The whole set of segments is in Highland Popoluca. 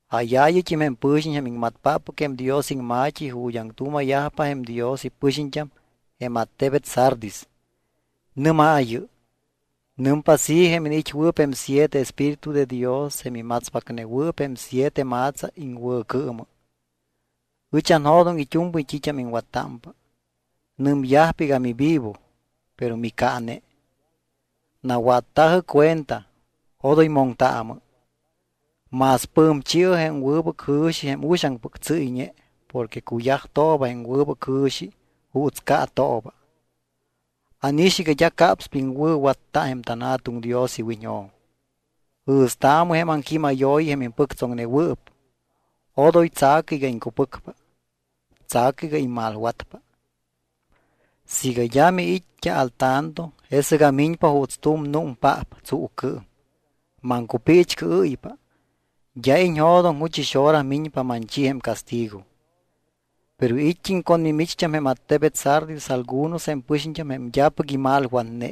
’Jáyaayɨt́im jém pɨ̱xiñ jém iŋmatpáppɨc jém Dios iŋma̱t́i ju̱t́ aŋtuuma̱yajpa jém Dios ipɨxiñt́am jém attebet Sardis: Nɨ́maayɨ: “Nɨmpa así jém iniit́wɨɨp jém siete espíritu de Dios jém imatspacnewɨɨp jém siete ma̱tsa iŋwɨ̱cɨɨmɨ: Ɨch anjo̱doŋ it́u̱mpɨy t́it́am iŋwattámpa. Nɨmyajpa iga mivivo, pero micaane. Nawatta̱jɨ cuenta, odoy moŋtaamɨ. Más pɨ̱mchi̱ɨ jém wɨbɨc jɨ̱xi jém uxaŋpɨc tsɨ́yñe porque cuyajtooba jém wɨbɨc jɨ̱xi juuts caatooba. Ánix iga d́a capspa iŋwɨ̱watta jém tanJa̱tuŋ Dios iwiñjo̱m. Jɨ̱staamɨ jém aŋquímayooyi jém impɨctsoŋnewɨɨp. Odoy tsa̱cɨ iga iŋcupɨcpa. Tsa̱cɨ iga immalwatpa. Siiga d́a miit́t́a al tanto, jesɨc amiñpa juuts tu̱m númpaap tsuucɨɨm. Maŋcupiichcɨɨ́ypa. D́a iñjo̱doŋ juchɨx hora miñpa manchi jém castigo. Pero it́t́im con mimicht́am jém attebet Sardis algunos jém pɨxiñt́am jém d́apɨc imalwatne,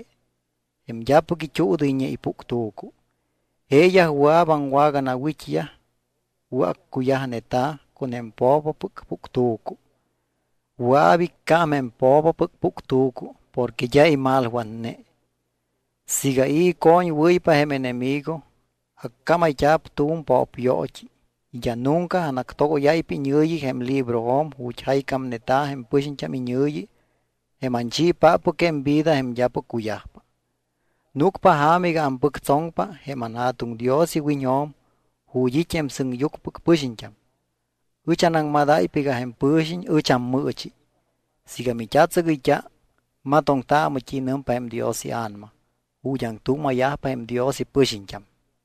jém d́apɨc it́uudɨyñe ipuctu̱cu. Jeeyaj wɨa̱p aŋwaganawit́yaj wɨ̱accuyajneta̱ con jém po̱popɨc puctu̱cu. Wɨa̱p icám jém po̱popɨc puctu̱cu porque d́a imalwatne. Siiga i̱ icoñwɨ́ypa jém enemigo, accámayt́a̱p tu̱m po̱pyoot́i y d́a nunca anactogóyáypa iñɨ̱yi jém librojo̱m ju̱t́ jaycámneta̱ jém pɨxiñt́am iñɨ̱yi jém anchiipáppɨc jém vida jém d́apɨc cuyajpa. Núcpa ja̱ma iga ampɨctsoŋpa jém anJa̱tuŋ Dios iwiñjo̱m ju̱t́ it́ jém sɨŋyucmɨpɨc pɨxiñt́am. Ɨch anaŋmadáypa iga jém pɨ̱xiñ ɨch ammɨɨchi. Siiga mit́atsɨgɨyt́a matoŋtaamɨ t́i nɨmpa jém Dios iA̱nama ju̱t́ aŋtuuma̱yajpa jém Dios ipɨxiñt́am.”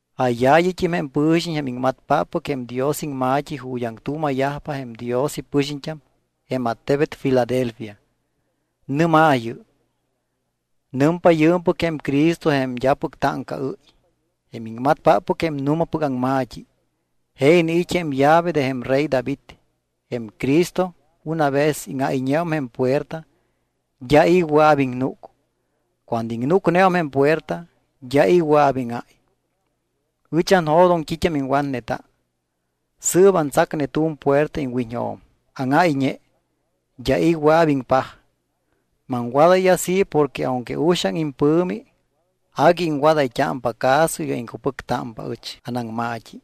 ’Jáyaayɨt́im jém pɨ̱xiñ jém iŋmatpáppɨc jém Dios iŋma̱t́i ju̱t́ aŋtuuma̱yajpa jém Dios ipɨxiñt́am jém attebet Filadelfia. Nɨ́maayɨ: “Nɨmpa yɨɨmpɨc jém Cristo jém d́apɨc táŋcaɨ́y, jém iŋmatpáppɨc jém nu̱mapɨc aŋma̱t́i. Je iniit́ jém llave de jém rey David. Jém Cristo una vez íŋáyñeum jém puerta d́a i̱ wɨa̱p iŋnúc. Cuando iŋnúcneum jém puerta d́a i̱ wɨa̱p íŋáy. Ɨch anjo̱doŋ t́it́am iŋwatneta. Sɨɨp, antsacne tu̱m puerta iŋwiñjo̱m, áŋáyñe. D́a i̱ wɨa̱p iŋpaj. Maŋwadáy así porque aunque uxaŋ impɨ̱mi, agui iŋwadayt́ámpa caso iga iŋcupɨctámpa ɨch anaŋma̱t́i.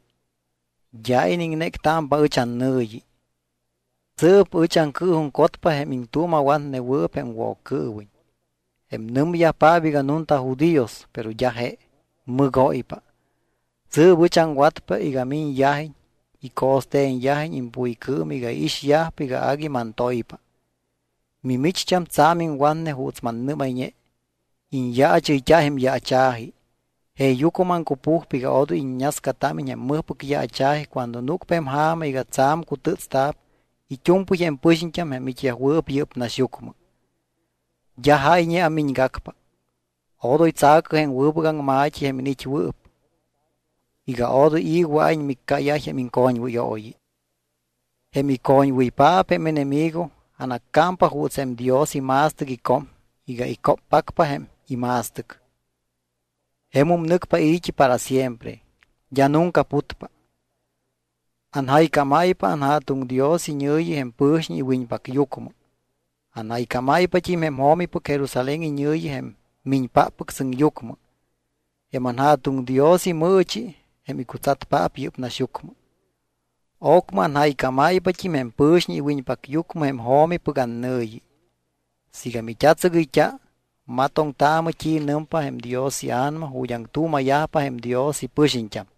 D́a iniŋnéctámpa ɨch annɨ̱yi. Sɨɨp ɨch aŋcɨɨjuŋcotpa jém iŋtuuma̱watnewɨɨp jém Woccɨɨwiñ, jém nɨmyajpaap iga nunta judíos pero d́a je, mɨgóypa. Sɨɨp ɨch aŋwatpa iga miñyajiñ y co̱ste̱nyajiñ impuycɨɨm iga iixyajpa iga agui mantoypa. Mimicht́am tsa̱m iŋwatne juuts mannɨ́mayñe. Iñyaachɨyt́a jém yaacha̱ji. Jeeyucmɨ maŋcupujpa iga odoy iññascatámiñ jém mɨjpɨc yaacha̱ji cuando núcpa jém ja̱ma iga tsa̱m cutɨ́tsta̱p it́u̱mpɨy jém pɨxiñt́am jém it́yajwɨɨp yɨ́p naxyucmɨ. D́a jáyñe amiñgacpa. Odoy tsa̱cɨ jém wɨbɨc aŋma̱t́i jém iniit́wɨɨp iga odoy i̱ wɨa̱iñ miccáyáy jém iŋcoñwɨyooyi. Jém icoñwɨypaap jém enemigo, anaccámpa juuts jém Dios ima̱stɨc icom iga icóppacpa jém ima̱stɨc. Jemum nɨcpa i̱t́i para siempre. D́a nunca putpa. Anjaycámáypa jém anJa̱tuŋ Dios iñɨ̱yi jém pɨ̱xiñ iwiñpacyucmɨ. Anjaycámáypat́im jém jo̱mipɨc Jerusalén iñɨ̱yi jém miñpáppɨc sɨŋyucmɨ. Jém anJa̱tuŋ Dios imɨɨchi jém icutsatpaap yɨ́p naxyucmɨ. Ocmɨ anjaycámáypat́im jém pɨ̱xiñ iwiñpacyucmɨ jém jo̱mipɨc annɨ̱yi. Siiga mit́atsɨgɨyt́a, matoŋtaamɨ t́i nɨmpa jém Dios iA̱nama ju̱t́ aŋtuuma̱yajpa jém Dios ipɨxiñt́am.”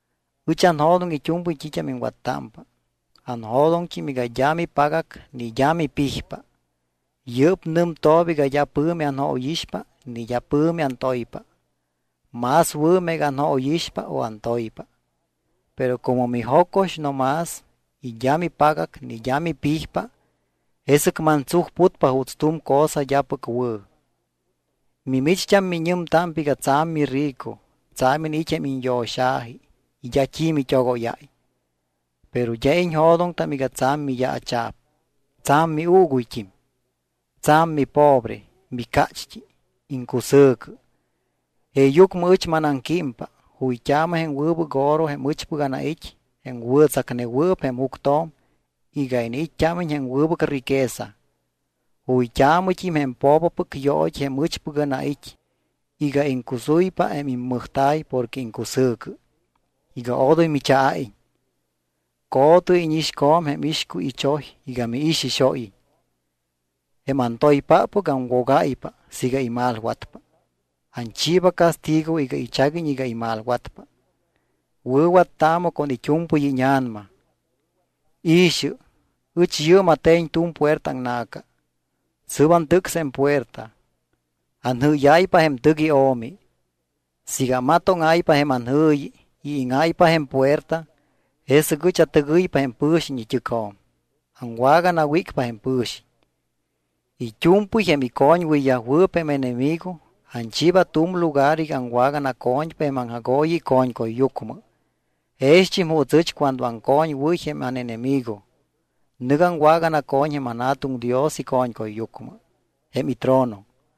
Ɨch anjo̱doŋ it́u̱mpɨy t́it́am iŋwattámpa. Anjo̱doŋt́im iga d́a mipagac ni d́a mipijpa. Yɨ́p nɨmtooba iga d́a pɨ̱mi anjóyixpa ni d́a pɨ̱mi antoypa. Más wɨ̱ meega anjóyixpa o antoypa. Pero como mijocox no más y d́a mipagac ni d́a mipijpa, jesɨc mantsujputpa juuts tu̱m cosa d́apɨc wɨ̱. Mimicht́am miñɨmtámpa iga tsa̱m mirico, tsa̱m iniit́ jém iñyo̱xa̱ji y d́a t́i mit́ogóyáy. Pero d́a iñjo̱doŋtam iga tsa̱m miyaacha̱p, tsa̱m miuuguyt́im. Tsa̱m mipobre, micácht́i, iŋcusɨ̱cɨ. Jeeyucmɨ ɨch manaŋquímpa: Juyt́aamɨ jém wɨbɨc oro jém ɨchpɨc anait́ jém wɨ̱tsacnewɨɨp jém juctjo̱m iga iniit́t́ámiñ jém wɨbɨc riqueza. Juyt́aamɨt́im jém po̱popɨc yoot́i jém ɨchpɨc anait́ iga iŋcusuypa jém immɨjta̱y porque iŋcusɨ̱cɨ iga odoy michaa̱iñ. Co̱tɨ íñixco̱m jém ixcuy ichoy iga miixixóyiñ. Jém antoypáppɨc aŋwogáypa siiga imalwatpa. Anchiiba castigo iga ichaguiñ iga imalwatpa. Wɨ̱wattaamɨ con it́u̱mpɨy íña̱nama. I̱xɨ, ɨch yɨɨm ate̱ñ tu̱m puerta aŋna̱ca. Sɨ́p antɨcs jém puerta. Anjɨ́yáypa jém tɨc io̱mi. Siiga amatóŋáypa jém anjɨ̱yi y íŋáypa jém puerta, jesɨc ɨch atɨgɨypa jém pɨ̱xiñ it́ɨcjo̱m. Aŋwaganawícpa jém pɨ̱xiñ. It́u̱mpɨy jém icoñwɨyyajwɨɨp jém enemigo anchiiba tu̱m lugar iga aŋwaganaco̱ñpa jém aŋjagooyi ico̱ñcuyyucmɨ. Jext́im juuts aɨch cuando aŋcoñwɨ́y jém ánenemigo, nɨc aŋwaganaco̱ñ jém anJa̱tuŋ Dios ico̱ñcuyyucmɨ, jém itrono.